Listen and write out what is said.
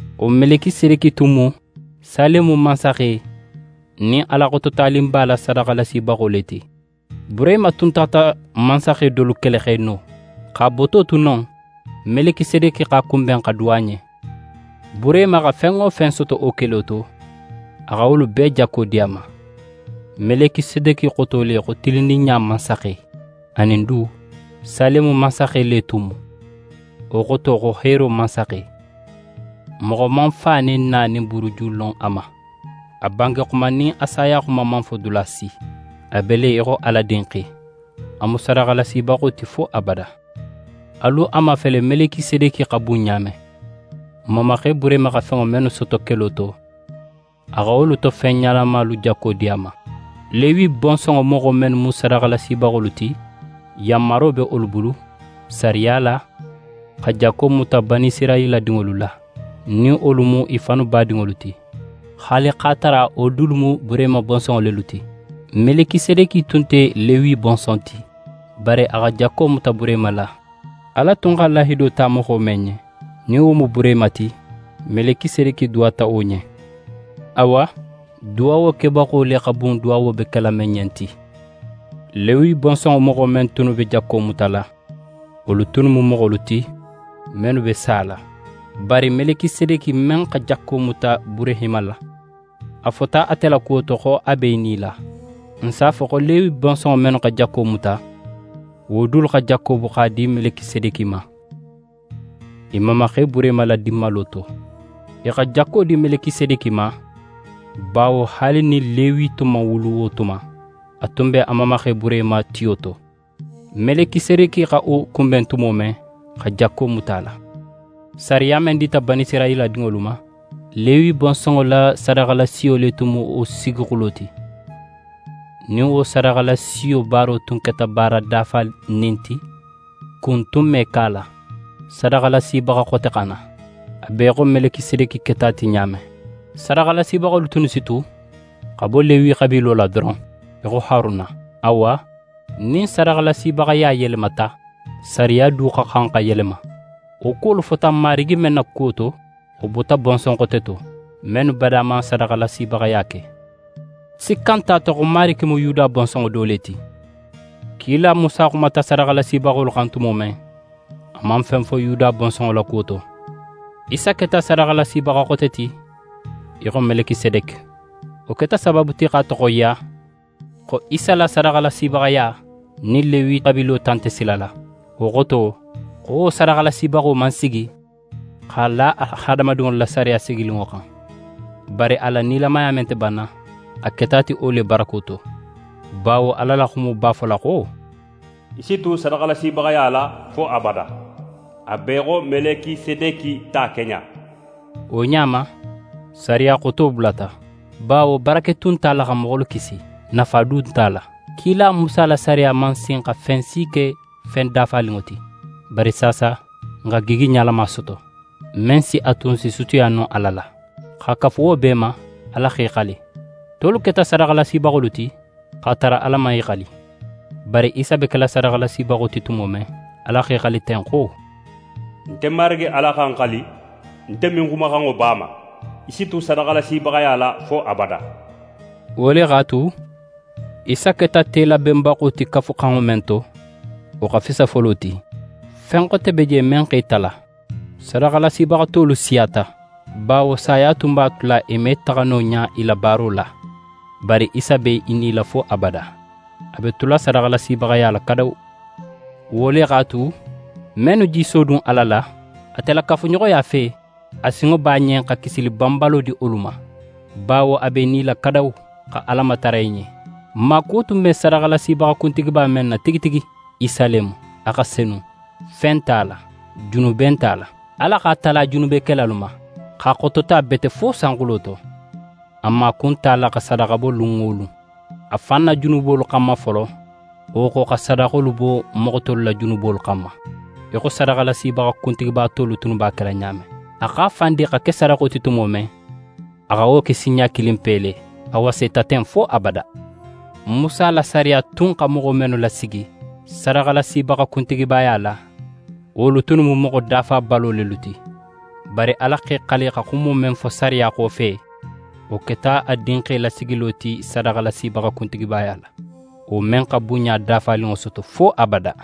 Wo Melikisedeki tun mu Salemu mansaxe nin Ala Xototaninba la sadaxalasibaxo le ti. Burehima tun taxata mansaxe dolu kele x'e no. X'a boto tu non, Melikisedeki x'a kunben xa duwa a ɲen. Burehima xa fen wo fen soto wo kelo to, a xa wolu bee jakko di a ma. Melikisedeki xoto le xo «tilinninɲa mansaxe». Anin du, Salemu mansaxe le tun mu. Wo xoto xo «heero mansaxe». Moxo man fa nin na nin buruju lon a ma. A bangexuma nin a sayaxuma man fo dula si. A be le í xo Ala Dinxe: A mu sadaxalasibaxo ti fo abada. Alu a mafele Melikisedeki xa bun ɲa men. N mamaxe Burehima xa fenŋo mennu soto kelo to, a xa wolu to fen ɲalamalu jakko di a ma. Lewi bonsonŋo moxo mennu mu sadaxalasibaxolu ti, yanmaro be wolu bulu, sariya la, xa jakko muta Banisirayila dinŋolu la, nin wolu mu i fannu badinŋolu ti, haali x'a tara wolu dulu mu Burehima bonsonŋo lelu ti. Melikisedeki tun nte Lewi bonson ti, bari a xa jakko muta Burehima la. Ala tun xa lahido ta moxo men ɲen, nin wo mu Burehima ti, Melikisedeki duwata wo ɲen. Awa, duwawo kebaxo le xa bun duwawo be kela men ɲen ti. Lewi bonsonŋo moxo men tunnu be jakko mutala, wolu tunnu mu moxolu ti, mennu be sala. Bari Melikisedeki men xa jakko muta Burehima la, a fota ate la kuwo to xo a be í nila. N si a fo xo Lewi bonsonŋo mennu xa jakko muta, wo dulu xa jakko bo x'a di Melikisedeki ma, i mamaxe Burehima la dinmalo to. I xa jakko di Melikisedeki ma, bawo haali nin Lewi tun man wulu wo tuma, a tun be a mamaxe Burehima tiyo to, Melikisedeki xa wo kunben tumo men, xa jakko muta a la. Sariya men dita Banisirayila dinŋolu ma, Lewi bonsonŋo la sadaxalasiyo le tun mu wo sigixulo ti. Nin wo sadaxalasiyo baaro tun keta baara dafanin ti, kun tun me ke a la, sadaxalasibaxa xote xa na, a be í xo Melikisedeki keta ti ɲa men. Sadaxalasibaxolu tunnu si tu xa bo Lewi xabiilo la doron, í xo Haruna. Awa, nin sadaxalasibaxaya yelemata, sariya du xa xan xa yelema. Wo kuwolu fota n Marigi men na kuwo to, wo bota bonson xote to, mennu bada man sadaxalasibaxaya ke. Sikka nte a to xo Marigi mu Yuda bonsonŋo do le ti. Kila Musa xumata sadaxalasibaxolu xan tumo men, a man fen fo Yuda bonsonŋo la kuwo to. Isa keta sadaxalasibaxa xote ti í xo Melikisedeki. Wo keta sabaabu ti x'a toxoyiya xo Isa la sadaxalasibaxaya nin Lewi xabiilo ta nte sila la. Wo xoto, xo wo sadaxalasibaxo man sigi x'a la hadamadinŋolu la sariya sigininŋo xan; bari a la nilamaya men nte banna, a keta a ti wo le barako to. Bawo Ala la xumo b'a fola xo: «Í si tu sadaxalasibaxaya la fo abada, a be í xo Melikisedeki ta keɲa.» Wo ɲa ma, sariya xoto bulata, bawo barake tun nte a la xa moxolu kisi, nafa du nt'a la. Kila Musa la sariya man sin xa fen si ke fen dafaninŋo ti. Bari saasa, n xa gigi ɲalama soto, men si a tu n s'i sutiya no Ala la. X'a kafu wo bee ma, Ala x'é xali. Tolu keta sadaxalasibaxolu ti, x'a tara Ala man í xali. Bari Isa be kela sadaxalasibaxo ti tumo men, Ala x'é xali ten xo: «Nte Marigi Ala xa ń xali, nte me ń xumaxanŋo bo a ma: “Í si tu sadaxalasibaxaya la fo abada.”» Wo le x'a tu, Isa keta telabenbaxo ti Kafuxanŋo men to, wo xa fisa folo ti. Fen xote be je men x'e tala: Sadaxalasibaxa tolu siyata, bawo saya tun b'a tula i me taxa no ɲa i la baaro la. Bari Isa be í nila fo abada, a be tula sadaxalasibaxaya la kadawu. Wo le x'a tu, mennu je i sodun Ala la, ate la kafuɲoxoya fe, a sinŋo b'a ɲen xa kisili banbalo di wolu ma, bawo a b'é nila kadawu, xa Ala matara i ɲen. N maakuwo tun be sadaxalasibaxa kuntigiba men na tigi tigi, Isa le mu. A xa senu, fe nte a la, junube nte a la. Ala x'a tala junubekelalu ma, x'a xotota bete fo sanxulo to. A maaku nte a la xa sadaxa bo lun wo lun, a fan na junubolu xanma folo, wo xo xa sadaxolu bo moxo tolu la junubolu xanma, í xo sadaxalasibaxa kuntigiba tolu tunnu b'a kela ɲa men. A x'a fan di xa ke sadaxo ti tumo men, a xa wo ke sinɲa kilinpe le. A waseta ten fo abada. Musa la sariya tun xa moxo mennu lasigi sadaxalasibaxa kuntigibaya la, wolu tunnu mu moxo dafabalo lelu ti. Bari Ala x'é xali xa xumo men fo sariya xofe, wo keta a Dinxe lasigilo ti sadaxalasibaxa kuntigibaya la, wo men xa bunɲa dafaninŋo soto fo abada.